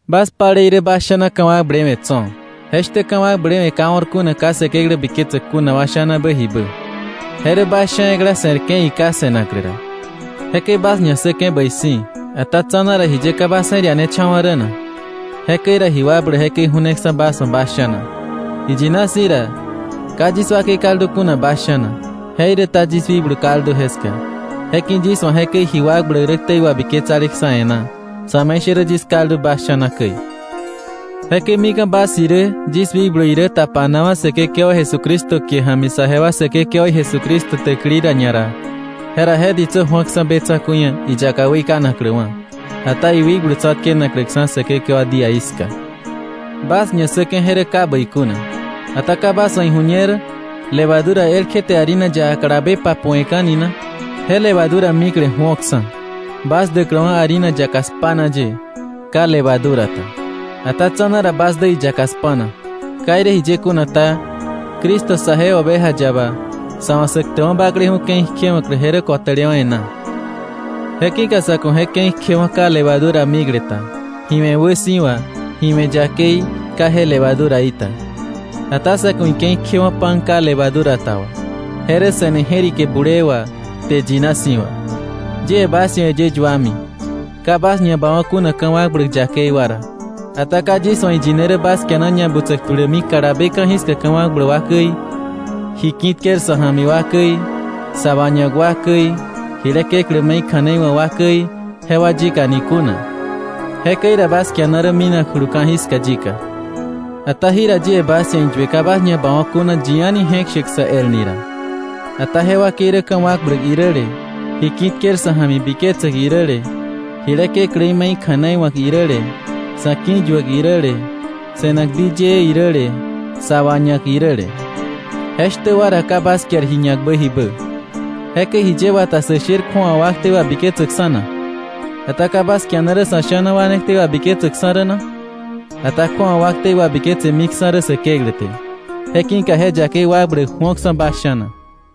Bas palei rä bas sha̱na ka̱wakblewe̱ tso̱. Je shtä ka̱wakblewe̱ ka o̱r kuna ka Säkeklä biketsäk kuna wa sha̱nabä jibä. Je rä bas sha̱ ekla se̱rke̱ iká se̱naklä ra. Jekäi bas ñassäke̱ bäi si̱, ata tsa̱na ra ¿jiye ka bas je̱r ianecha̱wa̱ rä na? Jekäi ra ji wakbläk jekäi ju̱neksa̱ bas wa̱ bas sha̱na. Iyina si̱ ra, ka yis wakei kaldu kuna bas sha̱na, jeiräta yis wikblu kaldu jeska; je ki̱ yis wa̱ jekäi ji wakbläk rä ktei wabiketsaleksa̱ e̱ná, sa̱me̱ishärä yis kaldu bas sha̱na käi. Jekäi mika̱ bas irä yis wikblu irä tapanawa̱ Säkekewa Jesucristo kie ja̱mi saje wa Säkekewaí Jesucristo täkili ra ñara, jera je ditsä ju̱oksa̱ be tsa̱ku̱i ia̱ iyaka weikanakläwa̱, ata iwikblu tsa̱tkenakläksa̱ Säkekewa díaí ska. Bas ñassäke̱ je rä ka bäi kuna. Ata ¿ka bas wa̱ ijuñer: “Levadura elkje te harina yaka kalabe papu̱we̱ka̱ni na?” Je levadura mikle ju̱oksa̱ bas däkläwa̱ harina yaka spa̱na ye, ka levadura ta. Ata tsa̱na ra bas dä iyaka spa̱na. Ka irä jiye kuna ta, Cristo saje oveja yaba, sa̱ wa̱ Sä Ktäkwa̱ Bakleju̱ Ke̱i kjewa̱klä je rä ko̱tälewa̱ e̱ná. Je ki̱ka sa̱ ku̱ je ke̱i kjewo̱ ka levadura mikle ta, ji we̱ wäsi̱wa, ji we̱ yakei, ka je levaduraí ta. Ata sa̱ ku̱ ike̱i kjewo̱ pan ka levadura ta wà. Je rä se̱ne je̱rike bulee wà, kte yina si̱ wà. Yie bas ia̱ äyë yuami, ka bas ñabawa̱ kuna ka̱wakbläk yakei wa ra. Ata ka yis wa̱ iyine rä bas kiana ñabutsäk tulämi kalabe ka̱jiska ka̱wakbläk wa käi, ji ki̱ tker sa̱ ja̱mi wa käi, sa̱ wañak wa käi, jile kekläí me̱i kja̱nei wa̱k wa käi jewa yika ni kuna. Jekäi ra bas kiana rä minakjulu ka̱jiska yika. Ata jira yie bas ia̱ iyue ka bas ñabawa̱ kuna yi a̱ni je̱k shäk sä el ni ra, ata je wakei rä ka̱wakbläk iräle, ji ki̱ tker sa̱ ja̱mi biketsäk iräle, jile kekläí me̱i kja̱nei wa̱k iräle, sa̱ ki̱yuäk iräle, se̱nak di yëë iräle, sa wañak iräle. Je shtä wa ra ka bas kiar ji ñakbä jibä. Jekäi ¿jiye wata sä sher kju̱awa wa ktei wabiketsäkksa̱ na? Ata ¿ka bas kiana rä sa̱ sha̱na wa ne ktei wabiketsäkksa̱ rä na? Ata kju̱awa wa ktei wabiketsemiksa̱ rä Säkeklä te. Je ki̱ka je yakei wakbläk ju̱oksa̱ bas sha̱na.